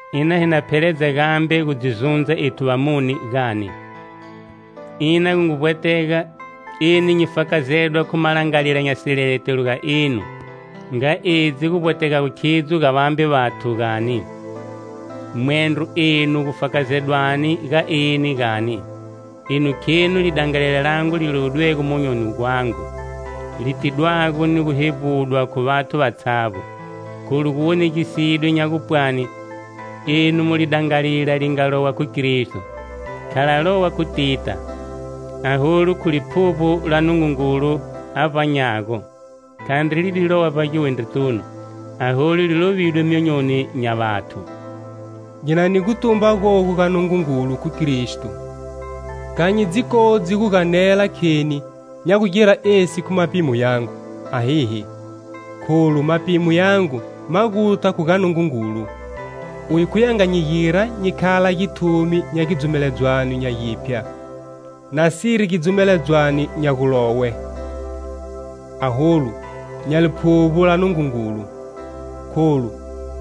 Ina hi na pheledza gambe gu dzi zundza ethu vamune gani? Ina gu ngu vbwetega eni nyi fakazedwa khu malangalila nya sileletelo ga enu, nga edzi gu vbwetegago khidzo ga vambe vathu, gani? Mwendro enu gu fakazedwani ga eni, gani? Enu khenu lidangalila langu li lovidwego monyoni gwangu, li tidwago ni gu hevbudwa khu vathu vatshavbo. Kholu gu wonegisidwe nya gupwani enu mu lidangalila li nga lowa khu Kristo, kha la lowa khu tita, aholu khu Liphuvbo la Nungungulu a vbanyago; khandri li di lowa vbagiwindritunu aholu li lovidwe myonyoni nya vathu. Nyi na ni gutumba gogu ga Nungungulu, khu Kristo. Kha nyi dzi kodzi gu ganela kheni nya gugira esi khu mapimo yangu, ahihi; kholu mapimo yangu ma guta khu ga Nungungulu. Uye khuye a nga nyi gira nyi khala githumi nya gidzumeledzwano nya giphya, nasiri gidzumeledzwano nya gulowe, aholu nya Liphuvbo la Nungungulu; kholu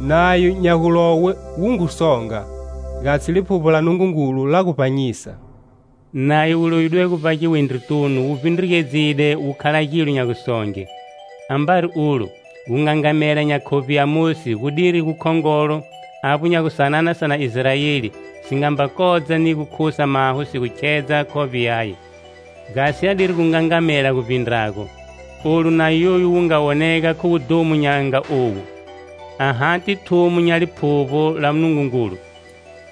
nayo nya gulowe wu ngu songa, gasi Liphuvbo la Nungungulu la gu vbanyisa. Nayo wu lovidwego vbagiwindritunu wu vbindrugedzile wu khala gilo nya gusonge. Ambari ulo, gungangamela nya khovbe ya Mosi gudiri gukhongolo, avbo nya gu sanana sa na Israeli si nga mba kodza ni gu khusa maho si gu khedza khovbe yaye. Gasi adiri gungangamela gu vbindrago. Olu Nayo yoyu wu nga wonega khu wudhumo nya nga owu, ahati thumo nya Liphuvbo la Nungungulu,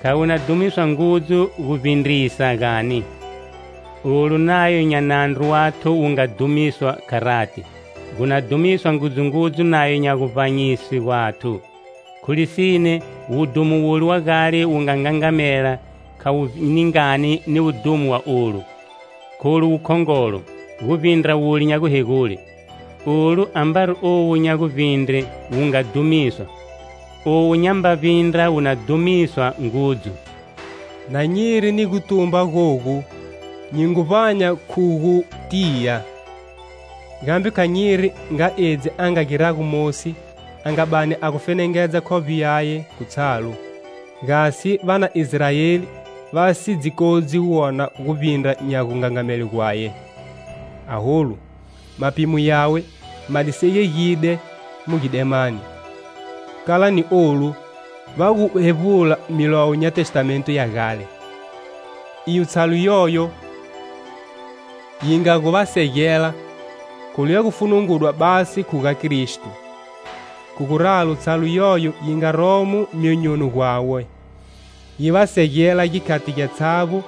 kha wu na dhumiswa ngudzu guvbindrisa, gani? Olu Nayo nya nandru wathu wu nga dhumiswa, kharati, gu na dhumiswa ngudzungudzu Nayo nya guvbanyiswe gwathu. Khu lisine wudhumo wule wa gale wu nga ngangamela kha wu ningani ni wudhumo wa olu, kholu wu khongolo, gu vbindra wule nya guhegule. Olu ambari owu nya guvbindre wu nga dhumiswa, owu nyamba vbindra wu na dhumiswa ngudzu! Na nyiri ni gutumba gogu, nyi ngu vbanya khu gu tiya. Gambe kha nyi giri nga edzi a nga girago Mosi a nga bani a gu fenengedza khovbe yaye khu tshalu, gasi va na Israeli va si dzi kodzi gu wona guvbindra nya gungangamele gwaye. Aholu mapimo yawe ma di segegide mu gidemani. Kala ni olu, va gu hevbula Milowo nya Testamento ya gale, iyo tshalu yoyo yi nga gu va segela, kholu ya gu funungudwa basi khu ga Kristo. Khu guralo tshalu yoyo yi nga romo myonyoni gwawe, yi va segela gikhati gyatshavbo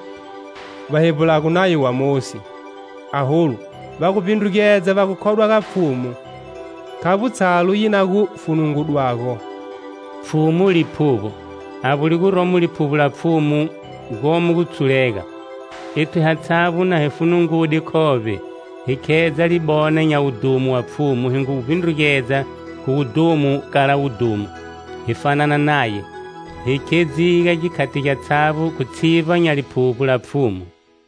va hevbulago Nayo wa Mosi. Aholu va gu vbindrugedza va khodwa ga Pfhumu, khavbo tshalu yi na gu funungudwago. Pfhumu Liphuvbo, avbo li guromo Liphuvbo la Pfhumu gomo gutshulega. Ethu hatshavbo na hi funungude khovbe, hi khedza libona nya wudhumo wa Pfhumu hi ngu vbindrugedza khu wudhumo kala wudhumo, hi fanana Naye, hi khedziga gikhati gyatshavbo khu tshivba nya Liphuvbo la Pfhumu.